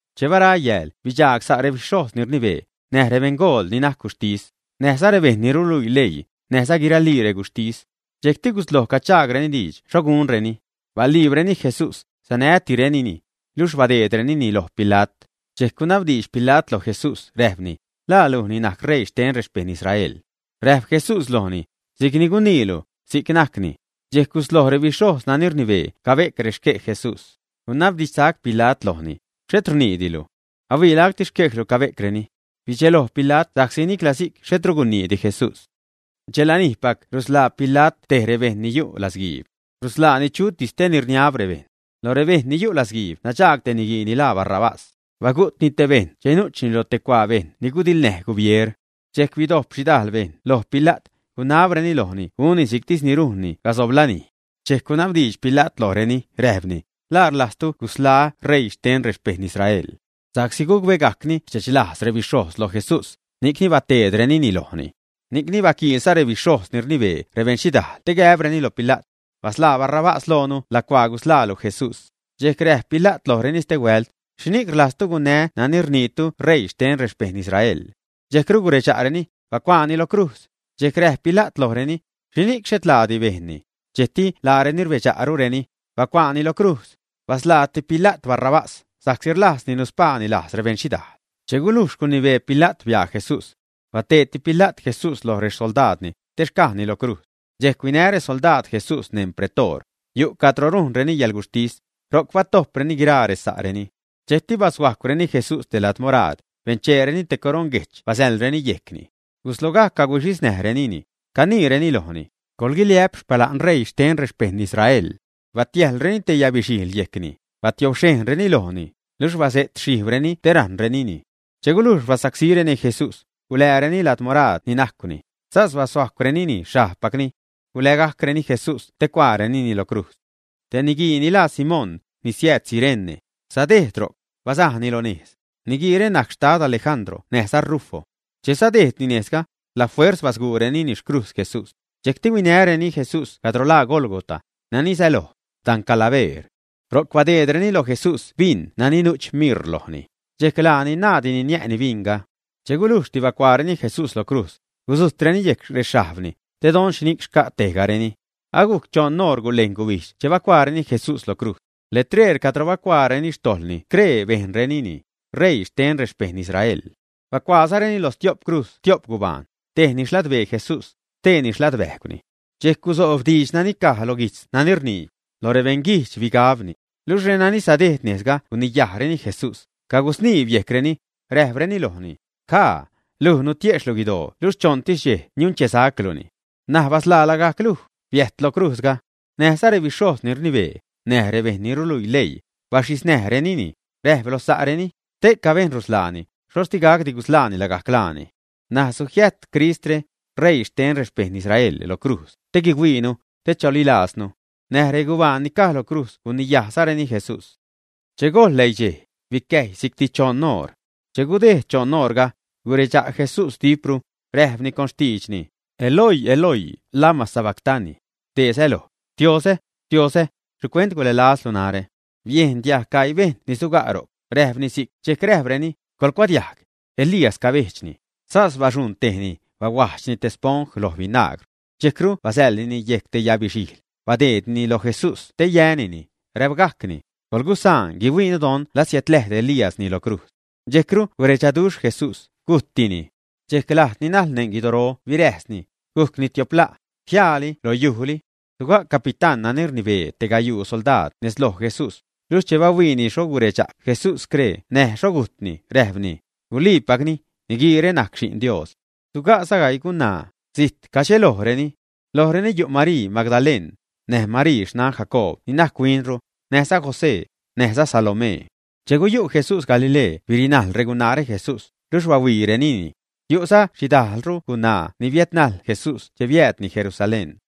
Che bara yääl bidxaag sa' rebixhojz ni rnibee, näj rebeṉgool ni najc guxhtis, näjza rebejṉ ni ruluii leii, näjza guiralii reguxhtis. Dxejcti gusloj cachaagreni diidx xho gunreni. Baliibreni Jesús, sanätirenini, niluxh badeedrenini loj Pila't. Dxejc gunabdiidx Pila't loj Jesús räjpni: ―¿La luj ni najc ṟeii xten rexpejṉ Israel, ä? Räjp Jesús lojni: ―Si'cni guniilu, si'c najcni. Dxejc gusloj rebixhojz nani rnibee cabe'c rexquej Jesús. Gunabdidxsac Pila't lojni: ―¿Xhet rniidilu ä? Ahuii lacti xquejlu cabe'creni. Bidxeloj Pila't sa'csi nicla si'c xhetru guniidi Jesús. Dxelanijpac rusḻaa Pila't tej rebejṉ ni yu' latzguiib. Rusḻaani chutis te ni rniab rebejṉ. Lo rebejṉ ni yu' latzguiib nadxaag te niguii ni laa Barrabás. Bagu'tni te bejṉ che nu'chni lo te cuaa bejṉ ni gudiḻnäj gubieer. Dxejc bidojp xhidajl bejṉ loj Pila't, gunabreni lojni gunni si'ctis rujnni casob lanij. Dxejc gunabdiidx Pila't lojreni, räjpni: ―¿La rlajztu gusḻaä́ ṟeii xten rexpejṉ Israel, ä? Sa'csi gucbegajcni rdxechlajz rebixhojz loj Jesús, ni'c bateedrenini lojni. Ni'cni baquiilza rebixhojz ni rnibee rebeṉxhidaal te gäbreni lo Pila't: ―Basḻaa Barrabás loonu lacuaa ni gusḻaalu Jesús. Dxejc räjp Pila't lojreni stehuält: ―¿Xhini'c rlajztu gunnää́ nani rniitu ṟeii xten rexpejṉ Israel? Dxejcru guredxa'reni: ―¡Bacuaani lo crujz! Dxejc räjp Pila't lojreni: ―¿Xhini'c xhet laati bejnni? Dxejcti laareni rbedxa'rureni: ―¡Bacuaani lo crujz! Basḻaati Pila't Barrabás, sa'csi rlajzni nuspaani lajz rebeṉxhidaal. Che gulujx gunibee Pila't, bia Jesús. Bateedti Pila't Jesús loj rexsoldaadni, te xcajni loj crujz. Dxejc huinä rexsoldaadni Jesús neṉ Pretoor, yu' cadro rujnreni yäḻguxhtis, ro'c batojpreni guiraa resa'reni. Dxejcti bashuajcwreni Jesús te lad moraad, bencheereni te coroṉ guejch basäḻreni yejcni. Guslogajc caguxhi näjrenini, caniireni lojni: ―¡Coḻguiliä'p xpala'n ṟeii xten rexpejṉ Israel! Batiäjlreni te yabixhijḻ yejcni, batiobxhejnreni lojni, luxh guzuxhijbreni te rajṉrenini. Che gulujx basacsíreni Jesús, gulääreni lad moraad ni najcwni, sas bashuajcwrenini xhajbpacni. Gulägajcreni Jesús te cuaarenini lo crujz. Te niguii ni laa Simón, ni siääd Cirene, sadejd ro'c, bazajni lo nejz. Niguiire najc xtad Alejandro näjza Rufo. Che sadejdni nejzga, la fuerz basguurenini xcrujz Jesús. Dxejcti huinäreni Jesús cadro laa Gólgota, nani säloj: dan Calabeer. Ro'c badeedreni lo Jesús bin nani nu'ch mir lojni, dxejc laani naaddini niä'ni binga. Che gulujxti bacuaareni Jesús loj crujz, gudzujtreni yejc rexhajbni, te don xhini'c xca' tejgareni. Agujc choṉ oṟ gulejn gubijdx che bacuaareni Jesús lo crujz. Letreer cadro bacuaareni xtojḻni scree bejnrenini: “R̲eii xten rexpejṉ Israel.” Bacuaazareni lo stiop crujz tiop gubaan, tejni xladbee Jesús, xtee xladbäjgwni. Dxejc guzojb diidx ni caj loj guijtz nani rnii: “Loj rebeṉguijdx bigabni.” Luxh renani sadejd nejzga guniyajreni Jesús, cagusniibreni yejcreni, räjpreni lojni: ―¡Jaa! Luj nutiejxhlu guidoo luxh choṉtis dxej niunchesacluni. N̲aj basḻaa lagajc luj, biäjt loj crujzga. Näjza rebixhojz ni rnibee, näj rebejṉ ni ruluii leii, baxhiznärenini, räjp loj sa'reni: ―Ste'ca bejṉ rusḻaani, xhoxh digacdi gusḻaani lagajc laani. N̲aj sujiäjt Cristre, ṟeii xten rexpejṉ Israel, lo crujz te guihuiinu, te chalilaaznu. Näj regubaan ni caj lo crujz guniyajzareni Jesús. Che gojḻ läidxej, bicäjy si'cti choṉ oṟ. Che gudejd choṉ oṟga, guredxa' Jesús dipro, räjpni con xtiidxni: ―Eloi, Eloi, ¿lama sabactani? ―dee säloj: Xtiozä, Xtiozä, ¿xhicuent gulälazlu narä? Biejn diajg gaii bejṉ ni suga' ro'c räjpni si'c, dxejc räjpreni: ―Coḻcuadiajg, Elías cabejdxni. Sas baxuṉ tejni, bahuajdxni te sponj loj binagr. Dxejcru basäḻnini yejc te yabixhijḻ, badeednini loj Jesús te yänini, räbgajcni: ―Coḻgusaan guihuiinu don la siädläjd Elíasni loj crujz. Dxejcru guredxaduxh Jesús, gujttini. Dxejc lajd ni najḻ neṉ guidoro biräjsni, gujcni tiop la', jiaali lo yujli. Suga' capitán nani rnibee te gayuu soldaad nez loj Jesús, luxh che bahuiini xho guredxa' Jesús scree näj xho gujtni, räjpni: ―Guli'pacni, niguiire najc Xi'n Dios. Suga'za gaii gunaa, zijt cadxelojreni. Lojreni yu' Marii Magdaleṉ, näj Marii, xnan Jacob ni najc huinru, näjza José, näjza Salomee. Che guyu' Jesús Galilee birinajl regunaare Jesús, luxh bahuiirenini. Yu'za xhidajlru regunaa ni biädnajl Jesús che biäädni Jerusalén.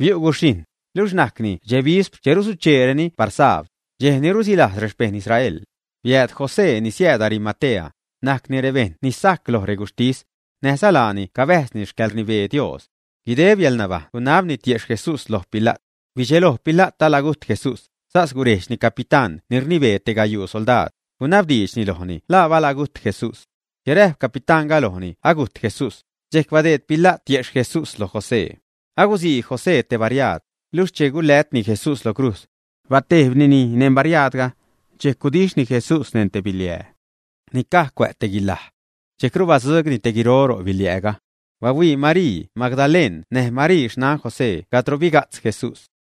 Biu' gudxhijṉ, luxh najcni dxe bispr che rusucheereni par sabd, dxej ni rusilajz rexpejṉ Israel. Biääd José ni siääd Arimatea, najcni te rebejṉ ni sajc loj reguxhtis. Näjza laani cabäjzni xcäḻrnibee Dios. Guideb yäḻnabajṉ gunabni tiexh Jesús lo Pila't. Bidxelo Pila't alagujt Jesús, sas gurejdxni capitán ni rnibee tej gayuu soldaad, gunabdiidxni lojni la balagujt Jesús. Che räjp capitánga lojni agujt Jesús, dxejc badeed Pila't tiexh Jesús loj José. Agusii José te bariaad, luxh che gulätni Jesús lo crujz, batejbnini neṉ bariaadga. Dxejc gudixhni Jesús neṉ te biliää ni caj cuä' te guilaj, dxejcru batzugni te guiro ro' biliääga. Bahuii Marii Magdaleṉ näj Marii xnan José cadro biga'tz Jesús.